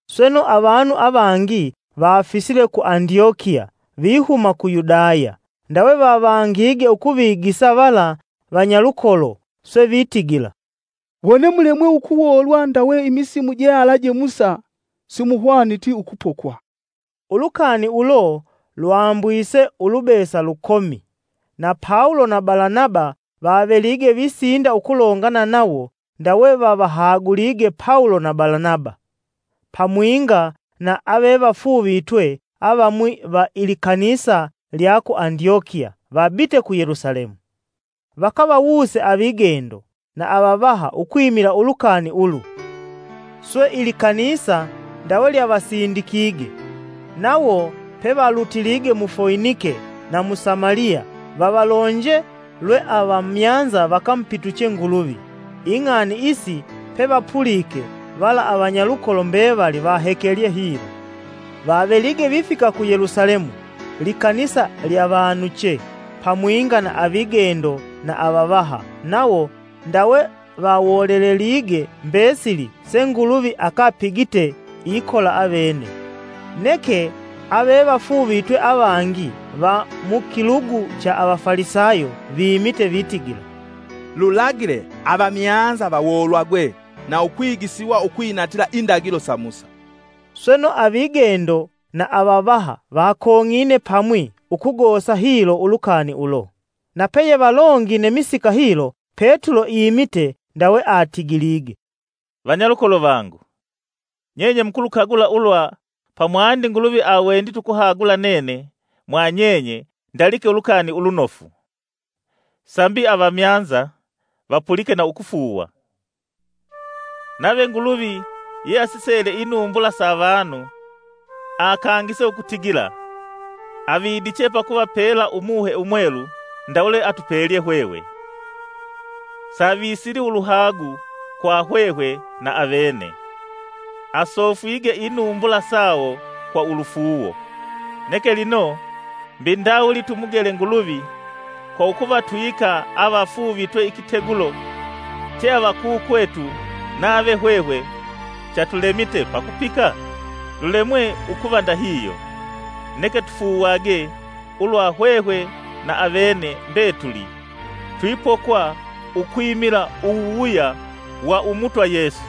Sweno, avanu avangi vafisile ku Andyokiya vihuma ku Yudaya ndawe vavangige ukuvigisa vala vanyalukolo swe vitigila, “Wone mulemwe ukuwoolwa ndawe imisimu jealaje Musa, simuhwaniti ukupokwa.” Ulukani ulo lwambwise ulubesa lukomi, na Pawulo na Balanaba vavelige visinda ukulongana nawo, ndawe vavahagulige Pawulo na Balanaba pamwinga na avevafuuvitwe avamwi va ilikanisa lya ku Andyokiya vabite ku Yelusalemu, vakavawuse avigendo na avavaha ukwimila ulukani ulu. Swe, ilikanisa ndawe lyavasindikige, nawo pevalutilige mu Foinike na mu Samaliya vavalonje lwe avamyanza vakamupituche Nguluvi. ing'ani isi pevapulike vala avanyalukolo mbevali vahekelye hilo. Vavelige vifika ku Yelusalemu likanisa lyavanuche, pamwinga na avigendo na avavaha; nawo ndawe vawolelelige mbesili se Nguluvi akapigite ikola avene. Neke avevafuuvitwe avangi va mu Kilugu cha Avafalisayo vimite, vitigila, “Lulagile avamyanza vawoolwagwe na ukwigisiwa ukwinatila indagilo sa Musa.” Sweno, avigendo na avavaha vakong'ine pamwi ukugosa hilo ulukani ulo. Na peyevalongine misika hilo, Petulo imite, ndawe atigilige, “Vanyalukolo vangu, nyenye mukulukagula ulwa pamwandi Nguluvi awendite ukuhagula nene mwanyenye ndalike ulukani ulunofu, sambi avamyanza vapulike na ukufuuwa. Nave Nguluvi yeasisele inumbula sa avanu, akangise ukutigila avidiche pakuvapela Umuhe Umwelu ndawe lweatupelye hwehwe. Savisili uluhagu kwa hwehwe na avene; asofwige inumbula sawo kwa ulufuuwo. Neke lino, mbi ndawuli tumugele Nguluvi kwa ukuvatwika avafuuvitwe ikitegulo che avakukwetu nave hwehwe chatulemite pakupika? Lulemwe ukuva ndahihyo, neke tufuuwagwe ulwa hwehwe na avene mbetuli twipokwa ukwimila uwuwuya wa Umutwa Yesu.”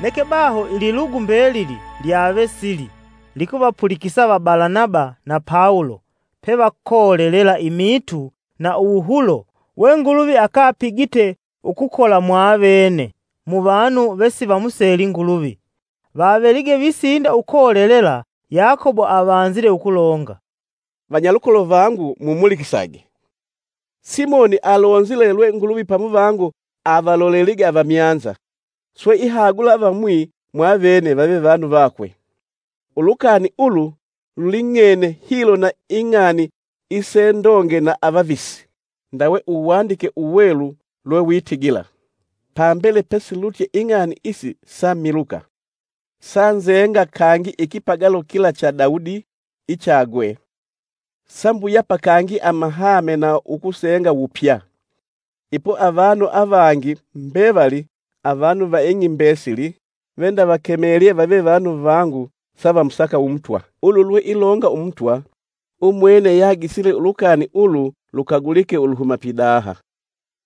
Neke baho ililugu mbelili lwave sili, likuvapulikisa va Balanaba na Pawulo pevakolelela imiitu na uwuhulo we Nguluvi akapigite kwa ukukola mwa vene mu vanu vesivamuseli Nguluvi. Vavelige visinda ukolelela, Yakobo avanzile ukulonga, “Vanyalukolo vangu mumulikisage! Simoni alonzile lwe Nguluvi pamuvango avalolelige avamyanza, swe ihagula avamwi mwa vene vave vanu vakwe. Ulukani ulu luling'ene hilo na Ing'ani isendonge na avavisi, ndawe uwandike uwelu lwewitigila: ‘Pambele pesilutye ing'ani isi samiluka, sanzenga kangi ikipagalo kila cha Dawudi ichagwe; sambuyapa kangi amahame na ukusenga wupya. Ipo avanu avangi mbevali, avanu va ing'i mbesili, vendavakemelye vave vanu vangu savamusaka Umutwa. Ulu lweilonga Umutwa, umwene yeagisile ulukani ulu lukagulike uluhuma pidaha.’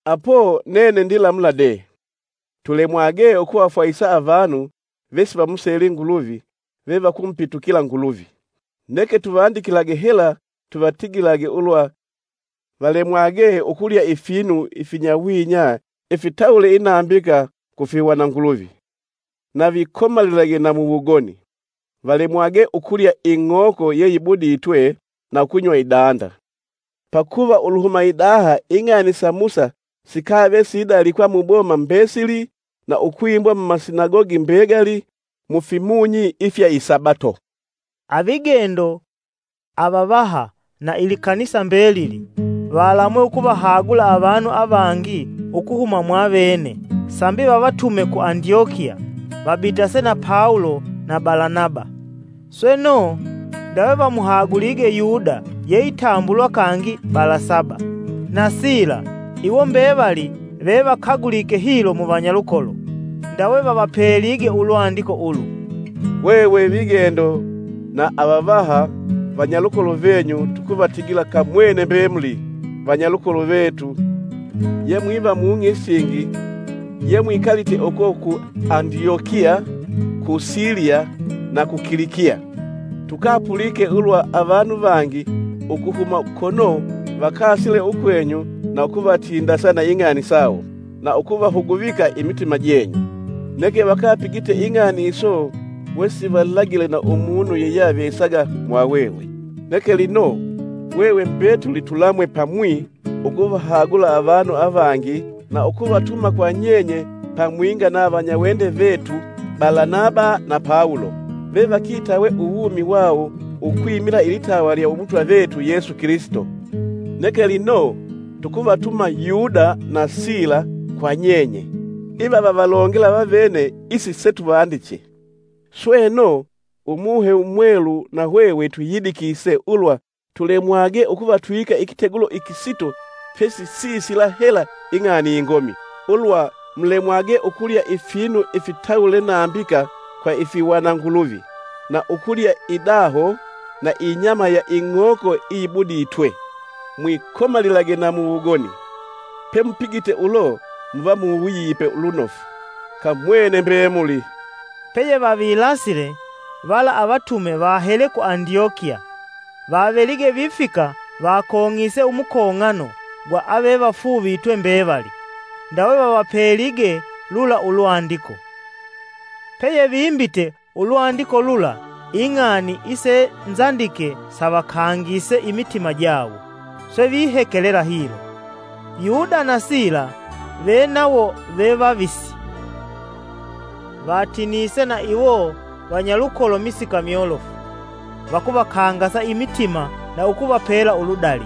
“Apo, nene ndilamula dee: tulemwage ukuvafwahisa avanu vesivamuseli Nguluvi (avamyanza) vevakumupitukila Nguluvi. Neke tuvandikilage hela tuvatigilage ulwa valemwage ukulya ifinu ifinyawinya ifitawule inambika kufihwananguluvi, na vikomalilage na mu wugoni; valemwage ukulya ing'oko yeyibuditwe na ukunywa idanda. Pakuva uluhuma idaha ing'ani sa Musa sikave sidalikwa muboma mbesili na ukwimbwa mumasinagogi mbegali mufimunyi ifya isabato.” Avigendo, avavaha na ilikanisa mbelili valamwe ukuvahagula avanu avangi ukuhuma mwavene sambi vavatume ku Andyokiya vabitase na Pawulo na Balanaba. Sweno, ndawe vamuhagulige Yuda yeitambulwa kangi Balanaba, na Sila iwo mbevali vevakagulike hilo mu vanyalukolo. Ndawe vavapelige ulwandiko ulu, “Hwehwe vigendo na avavaha, vanyalukolo venyu tukuvatigila kamwene mbemuli vanyalukolo vetu ye mwiva mung'i isingi yemwikalite uko ku Andyokiya, ku Siliya na ku Kilikiya. Tukapulike ulwa avanu vangi ukuhuma kono vakasile ukwenyu na ukuvatindasa na ing'ani sawo, na ukuvahuguvika imitima jenyu. Neke vakapigite ing'ani iso wesivalagile na umunu yeyeavesaga mwahwehwe. Neke lino, hwehwe mbetuli tulamwe pamwi ukuvahagula avanu avangi na ukuvatuma kwa nyenye pamwinga na vanyawende vetu Balanaba na Pawulo, vevakitawe uwumi wawo ukwimila ilitawa lya Umutwa vetu Yesu Kilisito. Neke lino, tukuvatuma Yuda na Sila kwa nyenye; iva vavalongela vavene isi setuvandiche. Sweno, Umuhe Umwelu na hwehwe twiyidikise ulwa tulemwage ukuvatwika ikitegulo ikisito pesi sisila hela ing'ani ingomi: ulwa mulemwage ukulya ifinu ifitawule nambika kwa ifihwana nguluvi; na uliya idaho; na inyama ya ing'oko iyibuditwe; mwikomalilage na mu wugoni. Pemupigite ulo muva muwuyipe lunofu. Kamwene mbemuli!” Peyevavilasile, vala avatume vahele ku andyokiya, vavelige vifika vakong'ise umukong'ano gwa avevafuuvitwe mbevali, ndawe vavapelige lula ulwandiko. Peyevimbite ulwandiko lula ing'ani isenzandike savakangise imitima jawo, swe vihekelela hilo, Yuda na Sila, venawo ve vavisi, vatinise na iwo vanyalukolo kwa misika myolofu vakuvakangasa imitima na ukuvapela uludali.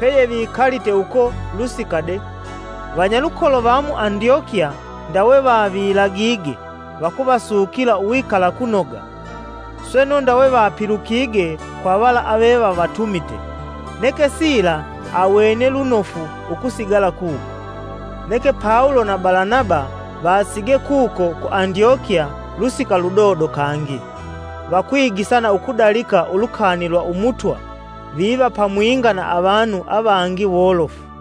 Peyevikalite uko kwa lusika de, vanyalukolo va mu Andyokiya ndawe vavilagige vakuvasukila uwikala kunoga, sweno ndawe vapilukige kwa vala avevavatumite. [ Neke Sila awene lunofu ukusigala kuko.] Neke Pawulo na Balanaba vasigee kuko ku Andyokiya kwa lusika ludodo kangi; vakwigisa na ukudalika ulukani lwa Umutwa, viva pamwinga na avanu avangi wolofu.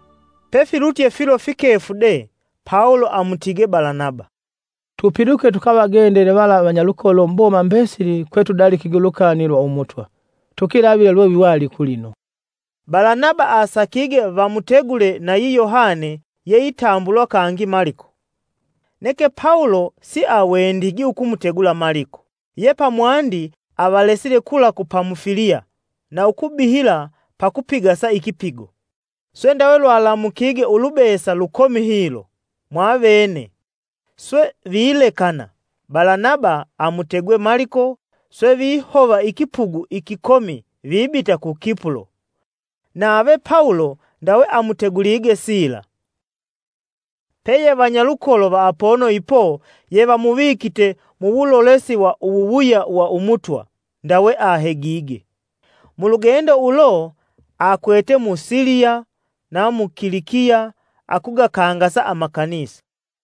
Pefilutye filo fikefu de, Pawulo amutige Balanaba, “Tupiluke tukavagendele vala vanyalukolo muboma mbesili kwetudalikige ulukani lwa Umutwa, tukilavile lweviwali kulino.” Balanaba asakige vamutegule nayi Yohane yeitambulwa kangi Maliko. Neke Pawulo siawendigi ukumutegula Maliko, ye pamwandi avalesile kula ku Pamufiliya na ukubihila pakupigasa ikipigo. Swe ndawe lwalamukige ulubesa lukomi hilo, mwavene, swe vilekana Balanaba amutegwe Maliko swe vihova ikipugu ikikomi vibita ku Kipulo. Nave Pawulo ndawe amutegulige Sila, peye vanyalukolo va apono ipo yevamuvikite muwulolesi wa uwuwuya wa Umutwa, ndawe ahegige. Mulugendo ulo, akwete mu Siliya na mu Kilikiya akugakangasa amakanisa.